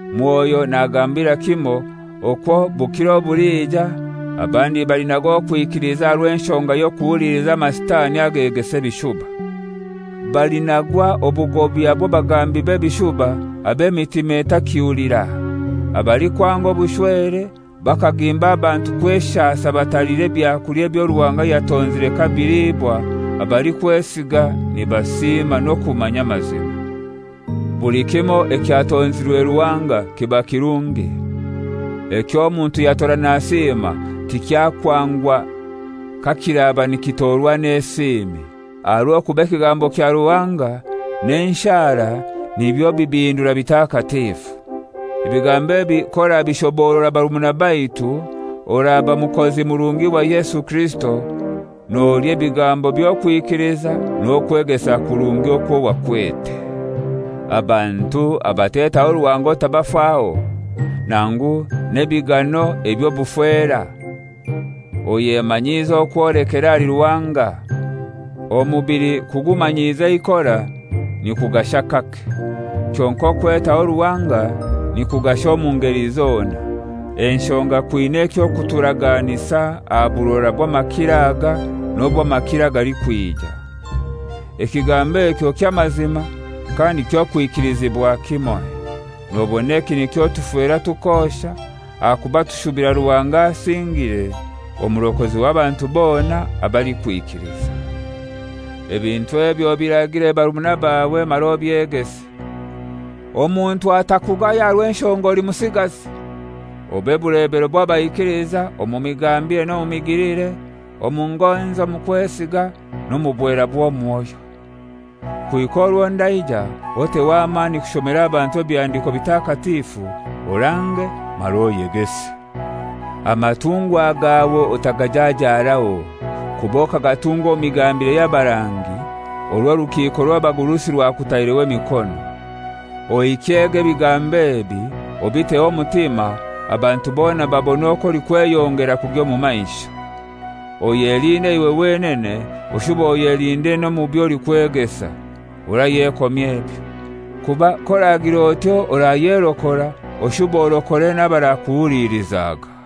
Mwoyo nagambira kimoi okwo bukiro obulija abandi balinaga okwikiliza aha rw'enshonga y'okuhuliliza amasitani agegesa ebishuba. Balinagwa obugobya bw'abagambi b'ebishuba ab'emitima etakihulira, abalikwanga obushwere, bakagimba abantu kweshasa bataliire byakulya ebyo Ruhanga yatonzire kabilibwa abalikwesiga nibasiima n'okumanya amazima. Buli kimoi ekyatonzirwe Ruhanga kiba kirungi. Eky'omuntu yatora nasiima tikyakwangwa kakiraba nikitorwa n'esiimi. Aha rw'okuba ekigambo kya Ruhanga n'enshara nibyo bibihindura bitakatifu. Ebigambo ebi k'orabishoborora barumuna baitu, oraba mukozi murungi wa Yesu Kirisito, nolya ebigambo by'okwikiliza n'okwegesa kurungi okwo wakwete. Abantu abatetaho Ruhanga otabafaho, nangu n'ebigano eby'obufera. Oyemanyiize okwolekera ahali Ruhanga. Omubili kugumanyiza eikora nikugasha kake, kyonkai okwetaho Ruhanga nikugasha omu ngeli zona, enshonga kwina ekyo kuturaganisa aha burora bw'amakiro aga n'obw'amakiro agalikwija. Ekigambo ekyo ky'amazima kandi kyokwikilizibwa kimoi. Nobona eki nikyo tufera tukosha, ahakuba tushubira Ruhanga asingire, Omurokozi w'abantu bona abalikwikiliza. Ebintu ebi obiragire barumuna bawe mara obyegese. Omuntu atakugaya aha rw'enshonga oli musigazi. Obe bulebero bw'abaikiliza omu migambire n'omu migilire, omu ngonzi, omu kwesiga, n'omu bwera bw'omwoyo. Kuhika orwo ndaija, oteho amani kushomera abantu Ebihandiko Bitakatifu, orange mara oyegese. Amatungwa gawe otagajajaaraho, kuba okagatungwa omu migambire y'abarangi orwo orukiiko rw'abagurusi rwakutaireho emikono. Ohikyega ebigambo ebi, obiteho omutima, abantu bona babone okwo olikweyongera kugya omu maisho. Oyelinde iwe wenene, oshube oyelinde n'omu by'olikwegesa. Orayekomya ebyo; kuba k'oragir'otyo orayerokora, oshube orokore n'abarakuhulilizaga.